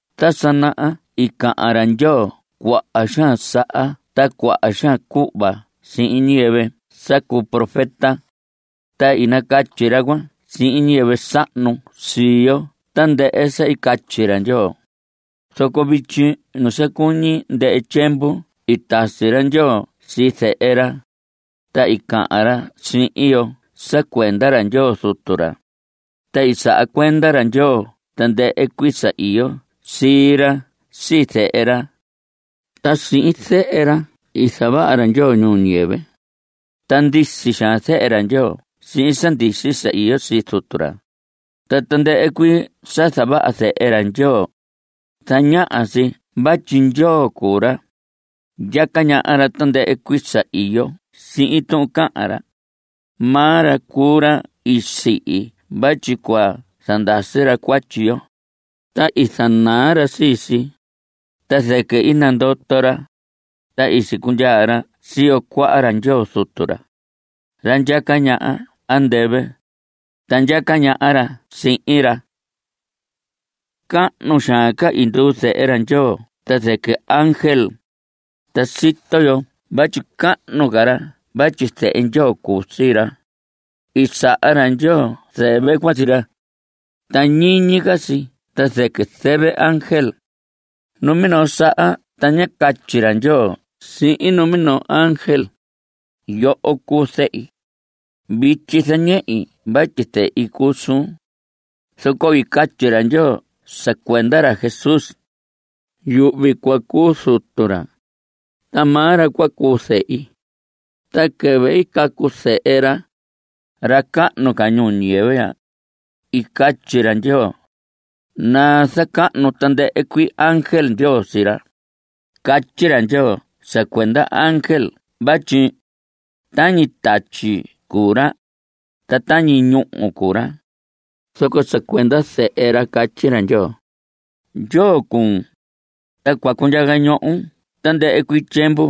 Ta sa naha i cahan ra Ndyoo cuaha xaan saha ta cuaha xaan cuhva sihin ñiyɨvɨ sa cuu profeta, ta i nacatyi ra cuan sihin ñiyɨvɨ sahnu sii yo tandɨhɨ sa i catyi ra Ndyoo. Zoco vityi nu sa cuñi ndɨhɨ tyiemvu i tasi ra Ndyoo sii Zehe ra, ta i cahan ra sihin yo sa cuenda ra Ndyoo Zutu ra. Ta i saha cuenda ra Ndyoo tandɨhɨ cuii sa iyo sii ra sii Zehe ra. Ta sihin Zehe ra i zavaha ra Ndyoo ñuu ñiyɨvɨ. Ta ndisi xaan Zehe ra Ndyoo sihin sa ndisi sa iyo sii Zutu ra. Ta tandɨhɨ cuii sa zavaha Zehe ra Ndyoo, zañaha si vatyi Ndyoo cuu ra. Ndyaca ñaha ra tandɨhɨ cuii sa iyo sihin tuhun cahan ra. Maa ra cuu ra i sihi vatyi cua zandasi ra cuatyi yo, ta i zanaa ra sii si. Ta zɨquɨ i nandoto ra, ta i sicundyaa ra siyo cuaha ra Ndyoo Zutu ra, ra ndyaca ñaha andɨvɨ. Ta ndyaca ñaha ra sihin ra. Cahnu xaan ca i nduu Zehe ra Ndyoo ta zɨquɨ ángel, ta sito yo vatyi cahnu ca ra vatyi Zehe Ndyoo cuu sii ra. I saha ra Ndyoo zɨvɨ cuan sii ra, ta ñiñi ca si ta zɨquɨ zɨvɨ ángel. Numinoo saha ta ñá catyi ra Ndyoo sihin numinoo ángel: Yoho cuu Zehi, Vityi zañehi vatyi Zehi cuu suun. Zoco i catyi ra Ndyoo sa cuenda ra Jesús: Yuhvi cua cuu zutu ra, Ta maa ra cua cuu zehi. Ta quɨvɨ i cacu Zehe ra, ra cahnu ca, ñuu ñiyɨvɨ ya, i catyi ra Ndyoo: Nazacahnu tandɨhɨ cuii ángel Ndyoo sii ra. Catyi ra Ndyoo sa cuenda ángel vatyi: Tañi tatyi cuu ra, ta tañi ñúhu cuu ra. Zoco sa cuenda Zehe ra catyi ra Ndyoo: Ndyoo cuun, ta cua cundyaca ñohon tandɨhɨ cuii tyiemvu.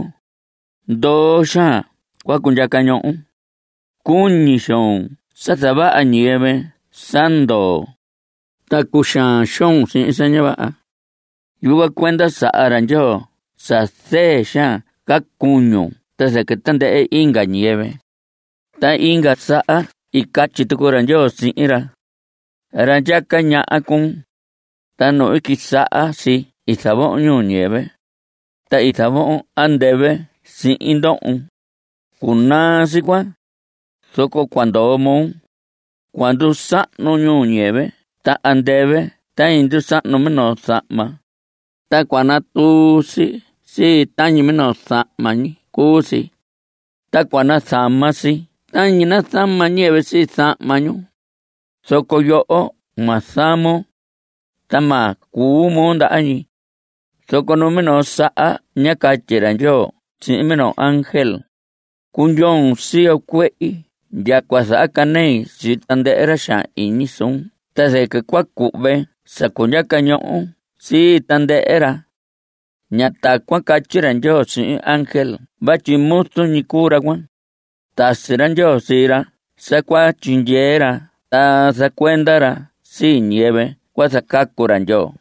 Ndoo xaan cua cundyaca ñohon. Cuñi xoon sa zavaha ñiyɨvɨ sa ndoo, ta cuxaan xoon sihin sa ña vaha. Yucuan cuenda saha ra Ndyoo sa zɨɨ xaan ca cuñun ta zɨquɨ tandɨhɨ inga ñiyɨvɨ. Ta inga saha i catyi tucu ra Ndyoo sihin ra: Ra ndyaca ñaha cuun, ta nu i quisaha si i zavohon ñuu ñiyɨvɨ, Ta i zavohon andɨvɨ sihin ndohon. Cunaa si cuan, zoco cua ndoo moo. Cua ndusahnu ñuu ñiyɨvɨ ta andɨvɨ tañi ndusahnu minoo zahma. Ta cua natuun sii si tañi minoo zahma ñi cuu si, ta cua nazama si tañi nazama ñiyɨvɨ sii zahma ñu. Zoco yoho ma zamon, ta ma cuu moo ndaha ñi. Zoco numinoo saha ñá catyi ra Ndyoo sihin minoo ángel: Cundyoon siyo cuehi ndya cua zahacanei sii tandɨhɨ ra xaan iñi suun ta zɨquɨ cua cuhve sa cundyaca ñohon sii tandɨhɨ ra. Ña tacuan catyi ra Ndyoo sihin ángel vatyi muzu ñi cuu ra cuan. Tasi ra Ndyoo sii ra sa cua tyindyee ra ta zacuenda ra sii ñiyɨvɨ cua zacacu ra Ndyoo.